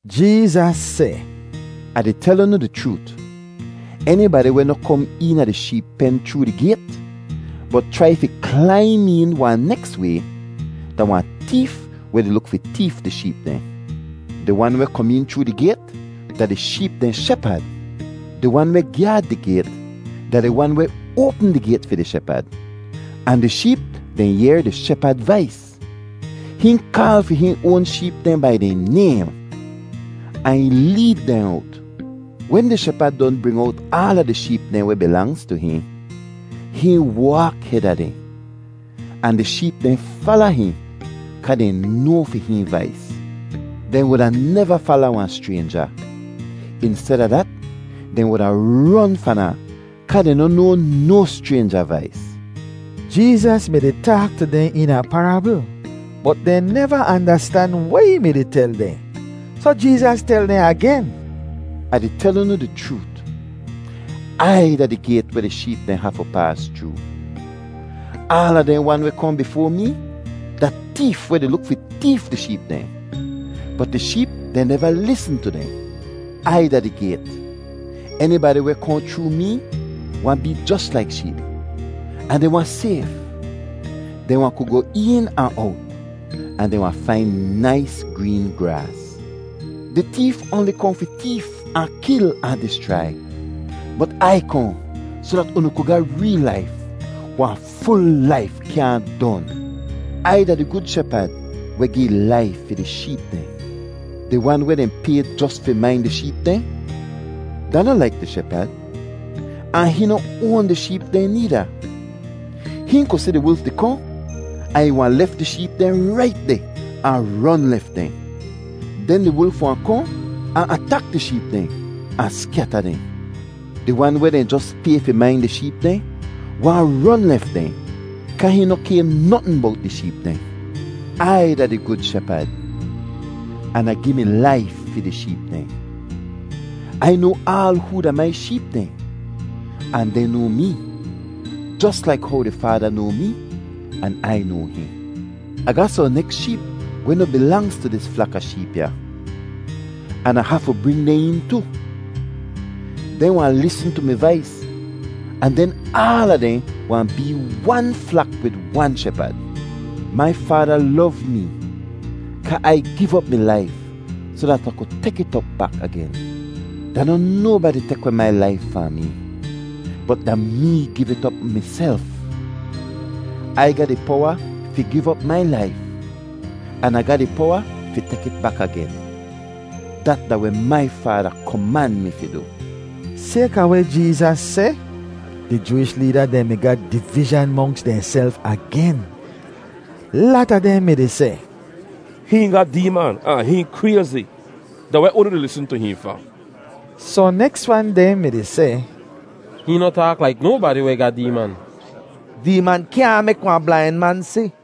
Jeezas seh, “Ah di tel unu di chroot, enibadi weh noh kom eena di sheep pen chroo di gayt, bot chrai fi klaim een wahn neks way, da wahn teef weh di luk fi teef di sheep dehn. Di wan weh kom een chroo di gayt da di sheep dehn shepad. Di wan weh gyaad di gayt da di wan weh oapm di gayt fi di shepad, ahn di sheep dehn yehr di shepad vais. Hihn kaal fi hihn oan sheep dehn bai dehn naym ahn ih leed dehn owt. Wen di shepad don bring owt aala di sheep dehn weh bilangz tu hihn, hihn waak heda dehn, ahn di sheep dehn fala hihn kaa dehn noa fi hihn vais. Dehn wuda neva fala wahn schraynja. Insteda dat, dehn wuda ron fahn ahn kaa dehn noh noa no schraynja vais.” Jeezas mi-di taak tu dehn eena parabl bot dehn neva andastan weh ih mi-di tel dehn. Soh Jeezas tel dehn agen, “Ah di tel unu di chroot, Ai da di gayt weh di sheep dehn hafu paas chroo. Aala dehn wan weh kohn bifoa mee da teef weh di luk fi teef di sheep dehn, bot di sheep dehn neva lisn tu dehn. Ai da di gayt. Enibadi weh kohn chroo mee wahn bee jos laik sheep, ahn dehn wahn sayf; dehn wahn ku goh een ahn owt ahn dehn wahn fain nais green graas. Di teef oanli kohn fi teef ahn kil ahn dischrai. Bot Ai kohn soh dat unu ku ga reel laif—wahn ful laif kyaahn don! “Ai da di gud Shepad weh gi ih laif fi di sheep dehn. Di wan weh dehn pay jos fi main di sheep dehn da noh laik di shepad, ahn hihn noh oan di sheep dehn needa. Hihn ku si di wulf di kohn ahn ih wahn lef di sheep dehn rait deh ahn ron lef dehn. Den di wulf wahn kohn ahn atak di sheep dehn ahn skyata dehn. Di wan weh dehn jos pay fi main di sheep dehn wahn ron lef dehn kaa hihn noh kay notn bowt di sheep dehn. “Ai da di gud Shepad an Ah gi mi laif fi di sheep dehn. Ai noa aal hoo da mai sheep dehn, ahn dehn noa mee, jos laik how di Faada noa mee an Ai noa hihn. Ah ga sohn neks sheep weh noh bilangz tu dis flak a sheep ya, an Ah hafu bring dehn een tu. Dehn wahn lisn tu mi vais ahn den aala dehn wahn bee wan flak wid wan shepad. Mai Faada lov mee kaa Ai giv op mi laif soh dat Ah ku tek it op bak agen. Da noh nobadi tek weh mai laif fahn mee, bot da mee giv it op miself. Ai ga di powa fi giv op mai laif, an Ah ga di powa fi tek it bak agen. Dat da weh mai Faada koman mi fi du.” Sayka weh Jeezas seh, di Jooish leeda dehn mi ga divizhan monks dehnself agen. Lata dehn mi-di seh, “Hihn ga deeman ahn hihn krayzi. Da weh unu di lisn tu hihn fa?” Sohn neks wan dehn mi-di seh, “Hihn noh taak laik nobadi weh ga deeman. Deeman kyaahn mek wahn blain man si.”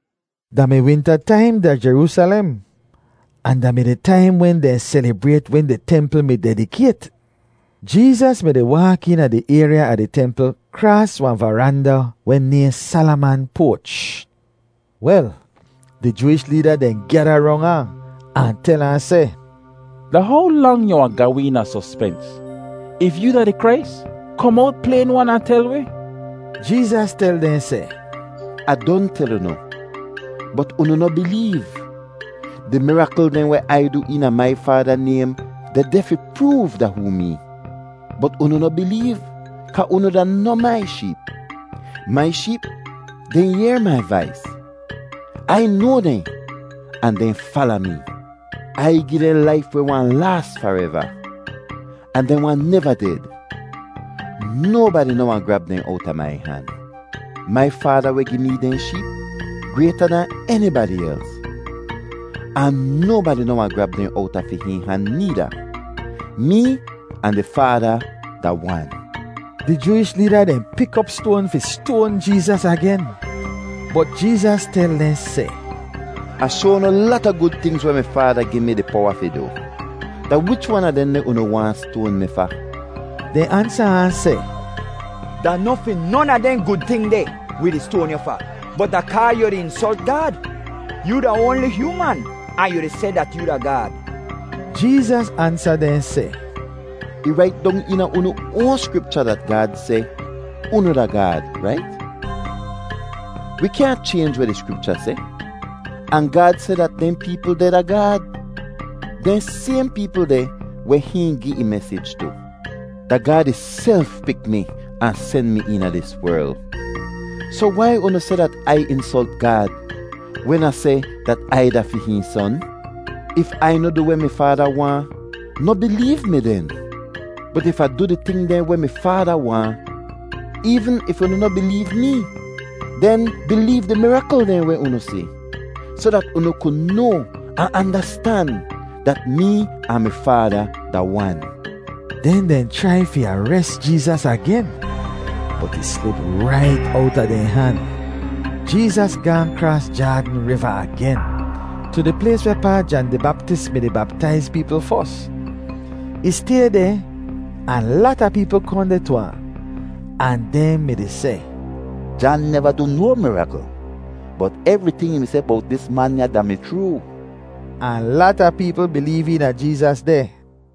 Da mi winta taim da Jeroosalem, ahn da mi di taim wen dehn selibrayt wen di templ mi dedikayt. Jeezas mi-di waak eena di ayrya a di templ kraas wahn varanda weh nayhn Salaman Poach. Wel, di Jooish leeda dehn gyada rong ahn, ahn tel ahn seh, “Da how lang yu wahn ga wi eena sospens? If yoo da di Krais, kom owt playn-wan ahn tel wi.” Jeezas tel dehn seh, “Ah don tel unu, bot unu noh bileev. Di mirakl dehn weh Ai du eena mai Faada naym dehdeh fi proov da hoo mee. Bot unu noh bileev kaa unu da noh mai sheep. Mai sheep dehn yehr mai vais. Ai noa dehn, ahn dehn fala mee. Ai gi dehn laif weh wahn laas fareva, ahn dehn wahn neva ded. Nobadi noh wahn grab dehn owta mai han. Mai Faada weh gi mee dehn sheep grayta dahn enibadi els, ahn nobadi noh wahn grab dehn owta fi hihn han needa. Mee ahn di Faada da wan.” Di Jooish leeda dehn pik op stoan fi stoan Jeezas agen, bot Jeezas tel dehn seh, “Ah shoa unu lata gud tingz weh mi Faada gi mi di powa fi du. Da wich wan a dehndeh unu waahn stoan mi fa?” Dehn ansa ahn seh, “Da noh fi non a dehn gud ting deh wi di stoan yu fa, bot da kaa yu di insolt Gaad. Yoo da oanli hyooman ahn yu di seh dat yoo da Gaad!” Jeezas ansa dehn seh, “Ih rait dong eena unu oan Skripcha dat Gaad seh, ‘Unu da gaad,’ rait? Wi kyaahn chaynj weh di Skripcha seh, ahn Gaad seh dat dehn peepl dehn da gaad—dehn sayhn peepl dehn weh hihn gi ih mesij tu. Da Gaad ihself pik mi ahn sen mi eena dis werl, soh wai unu seh dat Ai insolt Gaad wen Ah seh dat Ai da fi hihn Son? If Ai noh di du weh mi Faada waahn, noh bileev mi den. Bot If Ah di du di ting dehn weh mi Faada waahn, eevn if unu noh bileev mee, den bileev di mirakl dehn weh unu si, soh dat unu ku noa ahn andastan dat mee ahn mi Faada da wan.” Den dehn chrai fi ares Jeezas agen, bot ih slip rait owta dehn han. Jeezas gaahn kraas Jaadn Riva agen, tu di plays wehpaa Jan di Baptis mi-di baptaiz peepl fos. Ih stay deh ahn lata peepl kohn deh tu ahn, ahn dehn mi-di seh, “Jan neva du no mirakl, bot evriting ih mi seh bowt dis man ya da-mi chroo.” Ahn lata peepl bileev eena Jeezas deh.